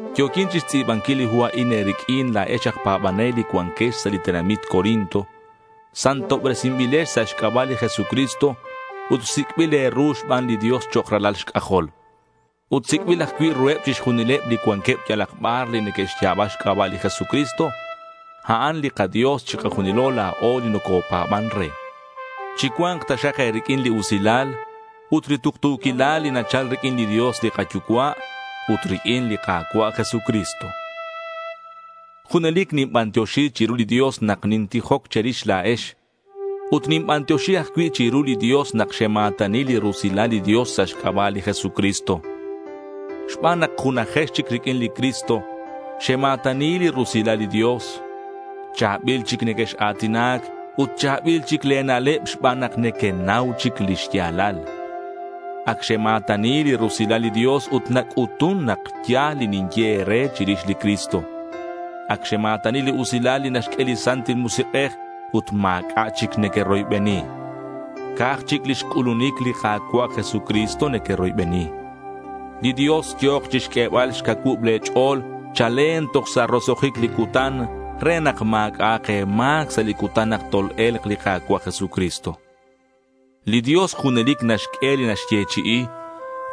Yo̱quin chixtz'i̱banquil li hu a'in e̱riq'uin la̱ex aj pa̱banel li cuanquex sa' li tenamit Corinto. Santobresinbilex sa' xc'aba' li Jesucristo ut sic'bil e̱ru xban li Dios chok' ralal xc'ajol. Ut sic'bil ajcui' ruheb chixjunileb li cuanqueb yalak bar li neque'xya̱ba xc'aba' li Jesucristo. A'an li kaDios chikajunilo la̱o li nocopa̱ban re. Chicua̱nk taxak e̱riq'uin li usilal ut li tuktu̱quilal li nachal riq'uin li Dios li kaYucua' ut riq'uin li Ka̱cua' Jesucristo. Junelic ninbantioxi chiru li Dios nak nintijoc che̱rix la̱ex ut ninbantioxi ajcui' chiru li Dios nak xema̱tani li rusilal li Dios sa' xc'aba' li Jesucristo. Xban nak junajex chic riq'uin li Cristo, xema̱tani li rusilal li Dios. Cha̱bil chic nequex-a̱tinac ut cha̱bil chic le̱ na'leb xban nak nequenau chic li xya̱lal. Ac xema̱tani li rusilal li Dios ut nac'utun nak ya̱l li quinye e̱re chirix li Cristo. Ac xema̱tani li usilal li naxq'ue li Santil Musik'ej ut ma̱c'a' chic nequeroybeni. Ca'aj chic lix c'ulunic li Ka̱cua' Jesucristo nequeroybeni. Li Dios yo̱k chixq'uebal xcacuub le̱ ch'o̱l chalen toj sa' roso'jic li cutan re nak ma̱c'a'ak e̱ma̱c sa' li cutan nak tol-e̱lk li Ka̱cua' Jesucristo. Li Dios junelic naxq'ue li naxyechi'i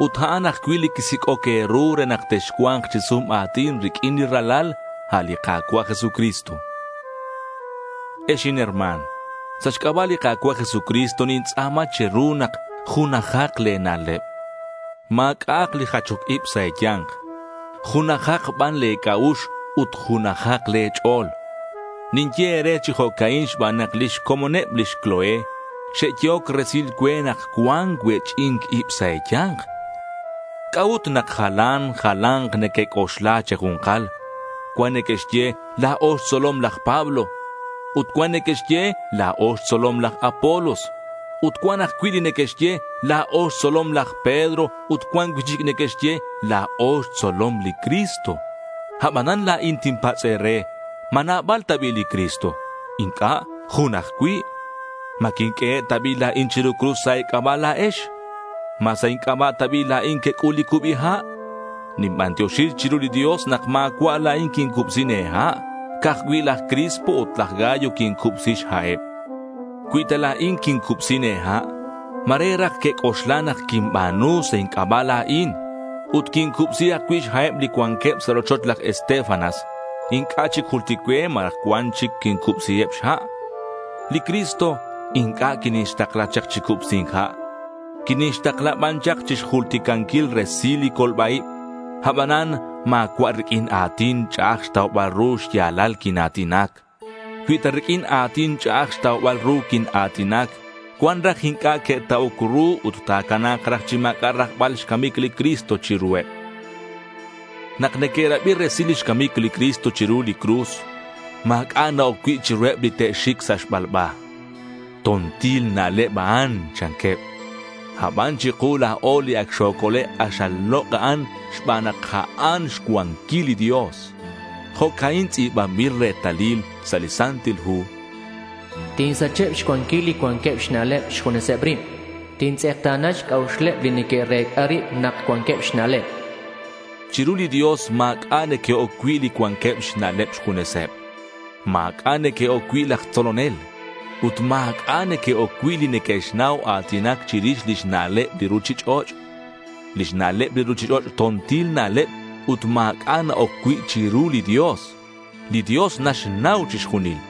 ut a'an ajcui' li quisic'oc e̱ru re nak texcua̱nk chi sum a̱tin riq'uin li Ralal, a' li Ka̱cua' Jesucristo. Ex inherma̱n, sa' xc'aba' li Ka̱cua' Jesucristo nintz'a̱ma che̱ru nak junajak le̱ na'leb. Ma̱c'a'ak li jachoc ib sa' e̱ya̱nk. Junajak ban le̱ c'a'ux ut junajak le̱ ch'o̱l. Ninye e̱re chi jo'ca'in xban nak lix comoneb lix Cloé xe'yehoc resil cue nak cuan cuech'i̱nc ib sa' e̱ya̱nk. ¿C'a'ut nak jalan jala̱nk nequec'oxla che̱ju̱nkal? Cuan neque'xye: La̱o xtzolom laj Pablo. Ut cuan neque'xye: La̱o xtzolom laj Apolos. Ut cuan ajcui' li neque'xye: La̱o xtzolom laj Pedro ut cuan cui'chic neque'xye: La̱o xtzolom li Cristo. Abanan la̱in tinpatz' e̱re, ¿ma nabal ta bi' li Cristo? Inc'a'. Jun ajcui'. ¿Ma quinq'uehe' ta bi' la̱in chiru cruz sa' e̱c'aba' la̱ex? ¿Ma sa' inc'aba' ta bi' la̱in quec'ul li cubi ha'? Ninbantioxi chiru li Dios nak ma̱cua' la̱in quincubsin e̱ha'. Ca'aj cui' laj Crispo ut laj Gayo quincubsi xha'eb. Cui ta la̱in quincubsin e̱ha', ma̱re raj quec'oxla nak quinba̱nu sa' inc'aba' la̱in. Ut quincubsi ajcui' xha'eb li cuanqueb sa' rochoch laj Estéfanas. Inc'a' chic jultic cue ma cuan chic quincubsiheb xha'. Li Cristo inc'a' quinixtakla chak chi cubsi̱nc ha'. Quinixtakla ban chak chixjulticanquil resil li colba-ib. Abanan ma̱cua' riq'uin a̱tin ch'a'aj xtaubal ru xya̱lal quina̱tinac. Cui ta riq'uin a̱tin ch'a'aj xtaubal ru quina̱tinac, cuan raj inc'a' que'ta'oc ru ut ta̱cana̱k raj chi ma̱c'a' rajbal xcamic li Cristo chiruheb. Nak neque'rabi resil lix camic li Cristo chiru li cruz, ma̱c'a' na-oc cui' chiruheb li te'xic sa' xbalba. To̱ntil na'leb a'an chanqueb. Aban chiku la̱o li ac xocole' k'axal lok' a'an xban nak a'an xcuanquil li Dios. Jo'ca'in tz'i̱banbil retalil sa' li Santil Hu: Tinsacheb xcuanquil li cuanqueb xna'leb xjuneseb rib. Tintz'ekta̱na xc'a'uxeb li neque'rec'a rib nak cuanqueb xna'leb. Chiru li Dios ma̱c'a' neque'oc cui' li cuanqueb xna'leb xjuneseb. Ma̱c'a' neque'oc cui' laj tzolonel. Ut ma̱c'a' neque'oc cui' li neque'xnau a̱tinac chirix lix na'leb li ruchich'och'. Lix na'leb li ruchich'och' to̱ntil na'leb ut ma̱c'a' na-oc cui' chiru li Dios. Li Dios naxnau chixjunil.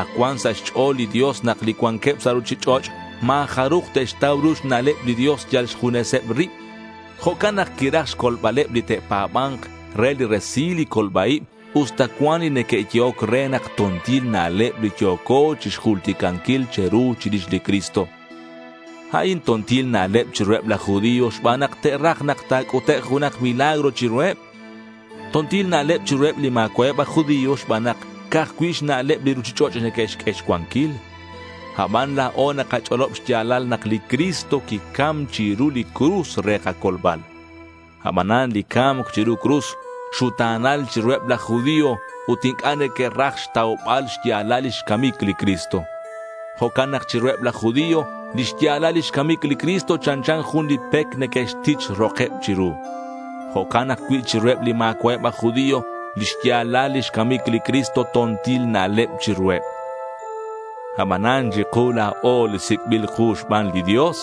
Ac cuan sa' xch'o̱l li Dios nak li cuanqueb sa' ruchich'och' ma̱ jaruj te'xtau ru xna'leb li Dios yal xjuneseb rib. Jo'can nak quiraj xcolbaleb li te'pa̱ba̱nk re li resil li colba-ib usta cuan li neque'yehoc re nak to̱ntil na'leb li yo̱co chixjulticanquil che̱ru chirix li Cristo. A'in to̱ntil na'leb chiruheb laj judío xban nak te'raj nak ta̱c'utek' junak milagro chiruheb. To̱ntil na'leb chiruheb li ma̱cua'eb aj judío xban nak ca'aj cui' xna'leb li ruchich'och' neque'xq'ue xcuanquil. Aban la̱o nakach'olob xya̱lal nak li Cristo quicam chiru li cruz re kacolbal. Abanan li ca̱mc chiru cruz xuta̱nal chiruheb laj judío ut inc'a' neque'raj xtaubal xya̱lal lix camic li Cristo. Jo'can nak chiruheb laj judío li xya̱lal lix camic li Cristo chanchan jun li pec neque'xtich rokeb chiru. Jo'can ajcui' chiruheb li ma̱cua'eb aj judío, li xya̱lal lix camic li Cristo to̱ntil na'leb chiruheb. Abanan chiku la̱o li sic'bil ku xban li Dios,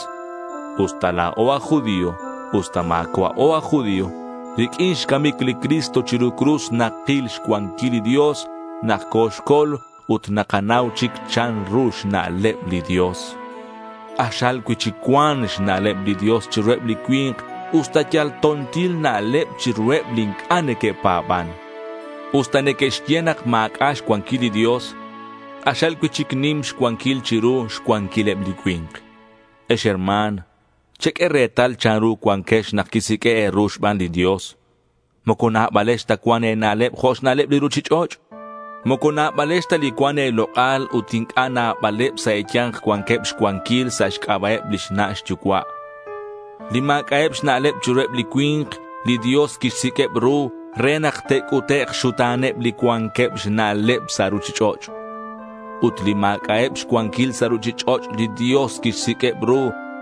usta la̱o aj judío usta ma̱cua'o aj judío, riq'uin xcamic li Cristo chiru cruz nakil xcuanquil li Dios nak coxcol ut nakanau chic chanru xna'leb li Dios. K'axal cui'chic cuan xna'leb li Dios chiruheb li cui̱nk usta yal to̱ntil na'leb chiruheb li inc'a' neque'pa̱ban. Usta neque'xye nak ma̱c'a' xcuanquil li Dios, k'axal cui'chic nim xcuanquil chiru xcuanquileb li cui̱nk. Ex herma̱n, cheq'ue retal chanru cuanquex nak quisiq'ue' e̱ru xban li Dios. Moco nabalex ta cuan e̱na'leb jo' xna'leb li ruchich'och'. Moco nabalex ta li cuan e̱lok'al ut inc'a' nabaleb sa' e̱ya̱nk cuanqueb xcuanquil sa' xc'aba'eb lix na' xyucua'. Li ma̱c'a'eb xna'leb chiruheb li cui̱nk, li Dios quixsiq'ueb ru re nak te'c'utek' xxuta̱neb li cuanqueb xna'leb sa' ruchich'och'. Ut li ma̱c'a'eb xcuanquil sa' ruchich'och' li Dios quixsiq'ueb ru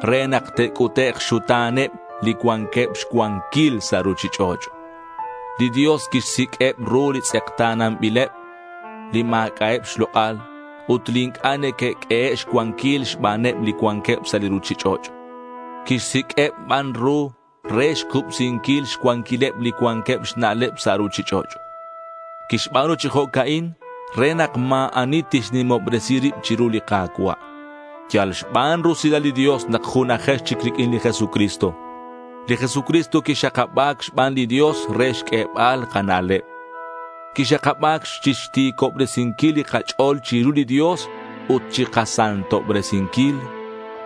re nak te'c'utek' xxuta̱neb li cuanqueb xcuanquil sa' ruchich'och'. Li Dios quixsiq'ueb ru li tz'ekta̱nanbileb li ma̱c'a'eb xlok'al ut li inc'a' neque'q'uehe' xcuanquil xbaneb li cuanqueb sa' li ruchich'och'. Quixsiq'ueb ban ru re xcubsinquil xcuanquileb li cuanqueb xna'leb sa' ruchich'och'. Quixba̱nu chi jo'ca'in re nak ma̱ ani tixnimobresi rib chiru li Ka̱cua'. Yal xban rusilal li Dios nak junajex chic riq'uin li Jesucristo. Li Jesucristo quixakaba̱c xban li Dios re xq'uebal kana'leb. Quixakaba̱c chixti̱cobresinquil li kach'o̱l chiru li Dios ut chikasantobresinquil.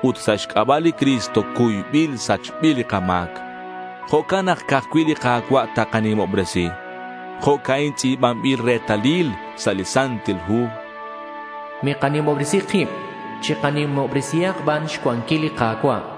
Ut sa' xc'aba' li Cristo cuybil sachbil li kama̱c. Jo'can nak ca'aj cui' li Ka̱cua' takanimobresi. Jo'ca'in tz'i̱banbil retalil sa' li Santil Hu: Mikanimobresi kib. Chikanimobresihak ban xcuanquil li Ka̱cua'.